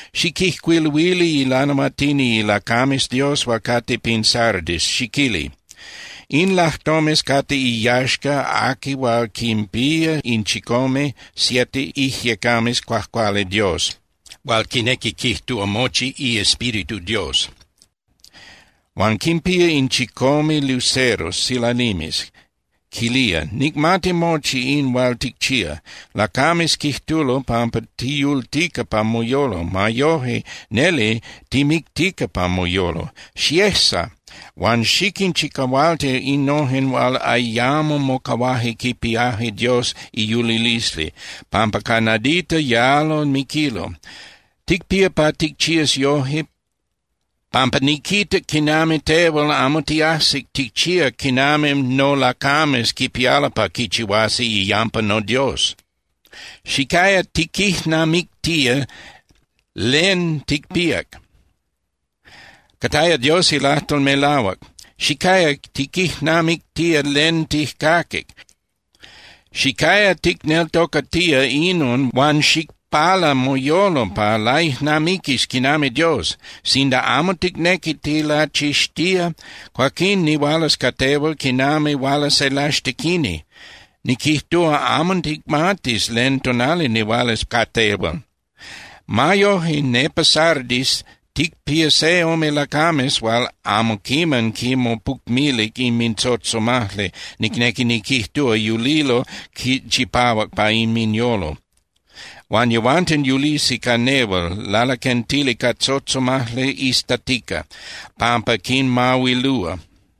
’Xiquijcuiluili ilanahuatini ilacames Dios hual cate pin Sardis, xiquili: “In lajtomes cate iyaxca aqui hual quinpía in chicome (siete) iIjyecames Cuajcuali Dios, hual quinequi quijtúa mochi iEspíritu Dios, huan quinpía in chicome luceros (silalimes), quilía: Nicmati mochi in hual ticchía. Lacames quijtulo pampa tiyultica pa moyolo. Ma yoje, neli timictica pa moyolo. Xiejsa huan xiquinchicahualti innojen hual ayamo mocahuaje quipiaje Dios iyulilisli, pampa ca nadita yalo miquilo. Ticpía pa ticchías yojque, pampa niquitac quinami tehual amo tiajsic ticchíac quinami nolacames quipialo pa quichihuasi iyampa noDios. Xicaya tiquijnamictía len ticpíac. Cataya Dios ilajtol melahuac. Xicaya tiquijnamictía len tijcaquic. Xicaya ticneltocatía inon huan xicpala moyolo pa laijnamiquis quinami Dios. Sinda amo ticnequi tilachixtía, cuaquín nihualas ca tehual quinami huala se laxtequini, niquijtúa, amo ticmatis len tonali nihualas ca tehual. Ma yoje nepa Sardis ticpía se ome lacames hual amo quiman quinmopucmilic inmintzotzomajli, nicnequi niquijtúa, yulilo chipahuac pa inminyolo. Huan yehuanten yulisi ca nehual lalaquentili ca tzotzomajli iztatica, pampa quinmahuilúa.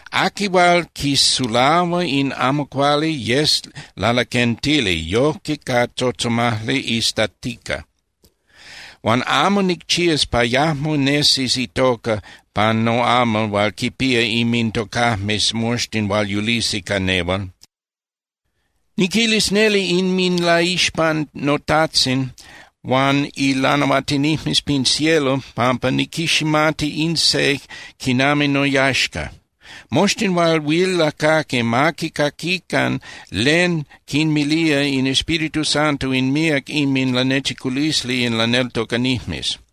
Aqui hual quisulahua in amo cuali yes lalaquentili yojque ca tzotzomajli iztatica. Huan amo nicchías pa yajmo nesis itoca pan noamal hual quinpía inmintocajmes moxtin hual yulisi ca nehual. Niquilis neli inminlaixpan noTajtzin huan ilanahuatinijmes pin cielo pampa niquiximati in se quinami noyaxca. Moxtin hual huil lacaqui, ma quicaquican len quinmilía in Espíritu Santo in míac inminlanechiculisli in laneltocanijmes.”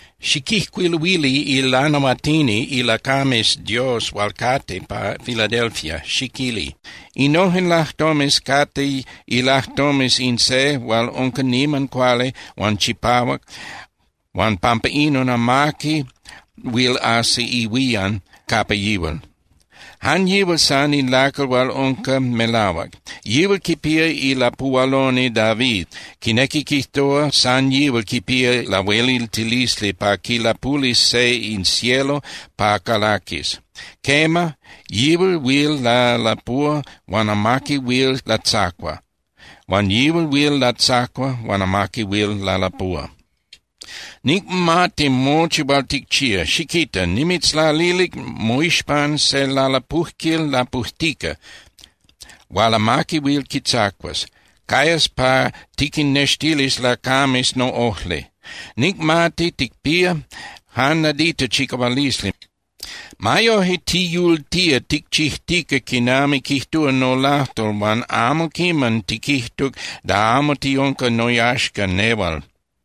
’Xiquijcuiluili ilanahuatini ilacames Dios hual cate pa Filadelfia, xiquili: “Innojen lajtomes cate ilajtomes in se hual unca niman cuali huan chipahuac huan pampa inon amaqui huil ajsi ihuían capa yihual. Jan yihual san in lacal hual unca melahuac. Yihual quipía ilapuhualoni David, quinequi quijtúa, san yihual quipía lahueliltilisli pa quilapulis se in cielo pa calaquis. Quema, yihual huil lalapúa huan amaqui huil latzacua. Huan yihual huil latzacua huan amaqui huil lalapúa: Nicmati mochi hual ticchía. Xiquita. Nimitzlalilic moixpan se lalapujquil lapujtica hual amaqui huil quitzacuas. Cayas pa tiquinnextilis lacames noꞌojli. Nicmati ticpía jan nadita chicahualisli. Ma yoje tiyultía ticchijtica quinami quijtúa nolajtol huan amo quiman tiquijtuc da amo tiunca noyaxca nehual.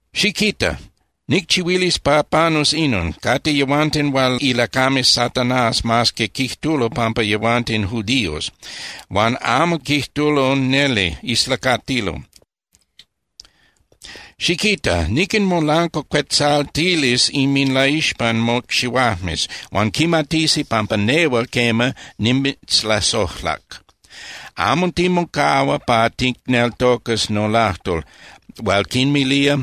Xiquita. Nicchihuilis pa panus inon: Cate yehuanten hual ilacames Satanás mas que quijtulo pampa yehuanten judíos, huan amo quijtulo neli, islacatilo. Xiquita. Niquinmolancuacuetzaltilis inminlaixpan mocxihuajmes, huan quimatisi pampa nehual, quema, nimitzlasojlac. Amo timocahua pa ticneltocas nolajtol hual quinmilía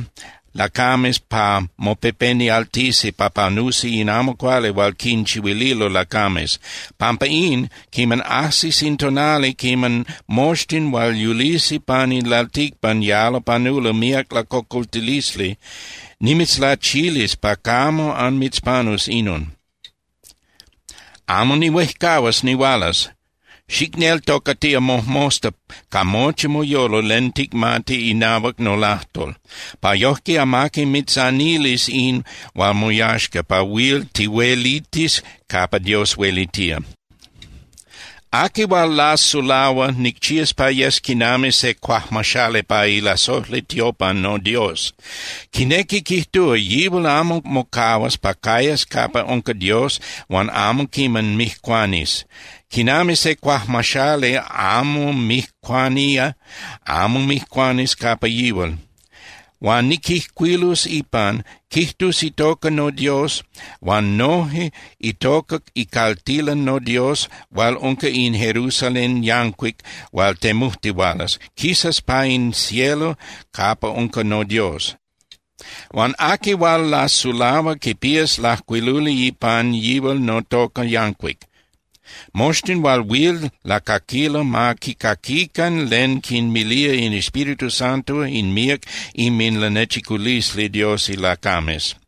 lacames pa mopepenialtisi pa panusi in amo cuali hual quinchihuililo lacames. Pampa in, quiman ajsis in tonali quiman moxtin hual yulisi pan in lalticpan yalo panulo míac lacocoltilisli, nimitzlachilis pa camo anmitzpanus inon. Amo nihuejcahuas nihualas. Xicneltocatía mojmosta ca mochi moyolo len ticmati inahuac nolajtol, pa yojque amaqui mitzanilis in hual moyaxca pa huil tihuelitis capa Dios huelitía. Aqui hual lasulahua nicchías pa yes quinami se cuajmaxali pa ilasojli tiopan noDios. Quinequi quijtúa, yihual amo mocahuas pa cayas capa unca Dios huan amo quiman mijcuanis. Quinami se cuajmaxali amo mijcuanía, amo mijcuanis capa yihual. Huan niquijcuilus ipan, quijtus itoca noDios huan noje itoca icaltilan noDios hual unca in Jerusalén yancuic hual temujtihualas, quisas pa in cielo capa unca noDios. Huan aqui hual lasulahua quipías lajcuiluli ipan yihual notoca yancuic. Moxtin hual huil lacaquilo ma quicaquican len quinmilía in Espíritu Santo in míac inminlanechiculisli Dios ilacames.”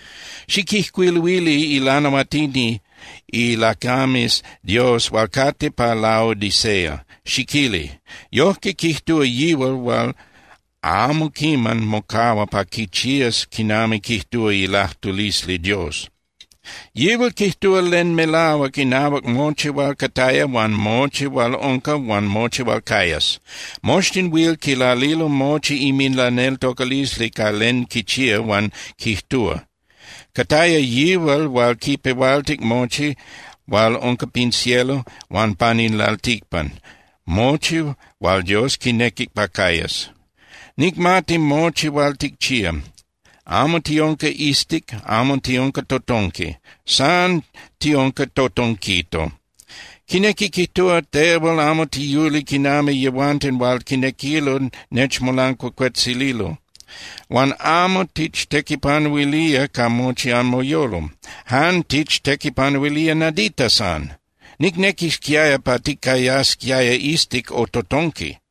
’Xiquijcuiluili ilanahuatini ilacames Dios hual cate pa Laodicea, xiquili: “Yojque quijtúa yihual hual amo quiman mocahua pa quichías quinami quijtúa ilajtulisli Dios. Yihual quijtúa len melahuac inahuac mochi hual cataya huan mochi hual unca huan mochi hual cayas. Moxtin huil quilalilo mochi inminlaneltocalisli ca len quichía huan quijtúa. Cataya yihual hual quipehualtic mochi hual unca pin cielo huan pan in lalticpan, mochi hual Dios quinequic pa cayas. Nicmati mochi hual ticchía. Amo tiunca iztic, amo tiunca totonqui, san tiunca totonquito. Quinequi quijtúa, tehual amo tiyuli quinami yehuanten hual quinequilo nechmolancuacuetzililo, huan amo tichtequipanuilía ca mochi anmoyolo, jan tichtequipanuilía nadita san. ¡Nicnequisquiaya pa ticayasquiaya iztic o totonqui!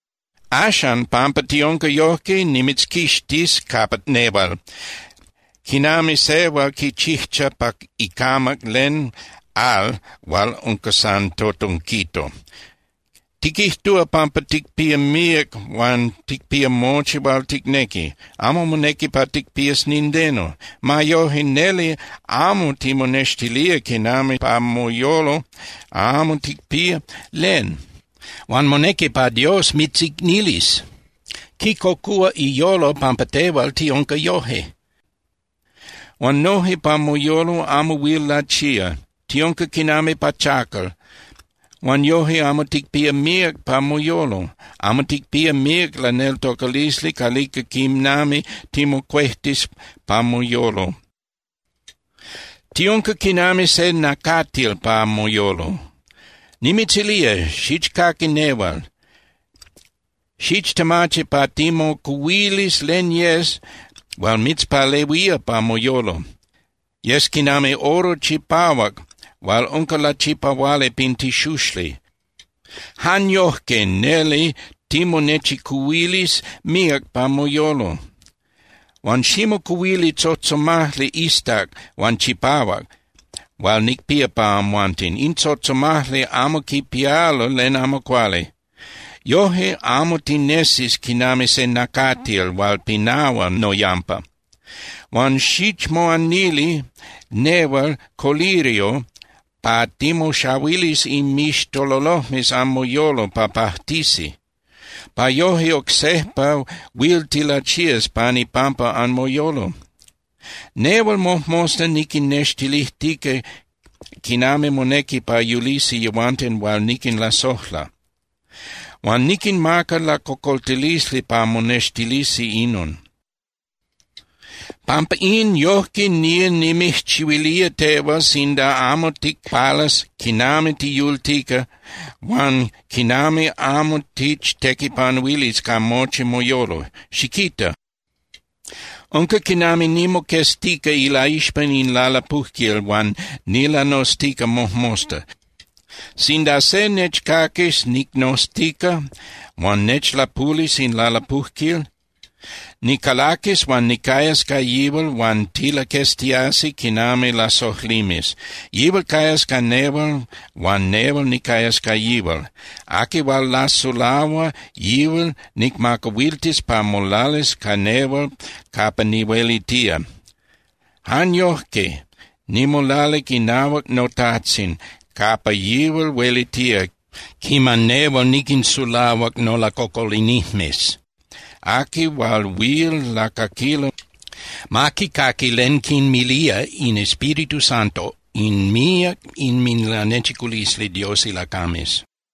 Axan, pampa tiunca yojque, nimitzquixtis capa nehual, quinami se hual quichijcha pa icamac len al hual unca san totonquito. Tiquijtúa pampa ticpía míac huan ticpía mochi hual ticnequi, amo monequi pa ticpías nindeno. Ma yoje, neli amo timonextilía quinami pa moyolo amo ticpía len. Huan monequi pa Dios mitzicnilis. Quicocúa iyolo pampa tehual tiunca yoje. Huan noje pa moyolo amo huil lachía, tiunca quinami pachacal huan yoje amo ticpía míac pa moyolo, amo ticpía míac laneltocalisli calica quinami timocuejtis pa moyolo, tiunca quinami se nacatil pa moyolo. Nimitzilía, xichcaqui nehual. Xichtemachi pa timocuhuilis len yes hual mitzpalehuía pa moyolo. Yes quinami oro chipahuac hual unca lachipahuali pin tixuxli. Jan yojque neli timonechicuhuilis míac pa moyolo. Huan ximocuhuili tzotzomajli iztac huan chipahuac hual nicpía pa amhuanten. In tzotzomajli amo quipialo len amo cuali. Yojque amo tinesis quinami se nacatil hual pinahua noyampa. Huan xichmoanili nehual colirio pa timoxahuilis inmixtololojmes anmoyolo pa pajtisi, pa yoje oc sejpa huil tilachías pan ipampa anmoyolo. Nehual mojmosta niquinnextilijtica quinami monequi pa yulisi yehuanten hual niquinlasojla. Huan niquinmaca lacocoltilisli pa monextilisi inon. Pampa in, yojque nía nimijchihuilía tehual sinda amo ticpalas quinami tiyultica huan quinami amo tichtequipanuilis ca mochi moyolo. Xiquita. Unca quinami nimoqueztica ilaixpan in lalapujquil huan nilanoztica mojmosta. Sinda se nechcaquis nicnoztica huan nechlapulis in lalapujquil, nicalaquis huan nicayas ca yihual huan tilaqueztiasi quinami lasojlimes. Yihual cayas ca nehual huan nehual nicayas ca yihual. Aqui hual lasulahua, yihual nicmacahuiltis pa molalis ca nehual capa nihuelitía. Jan yojque nimolalic inahuac noTajtzin capa yihual huelitía quiman nehual niquinsulahuac nolacocolinijmes. Aqui hual huil lacaquilo, ma quicaqui len quinmilía in Espíritu Santo in míac inminlanechiculisli Dios ilacames.”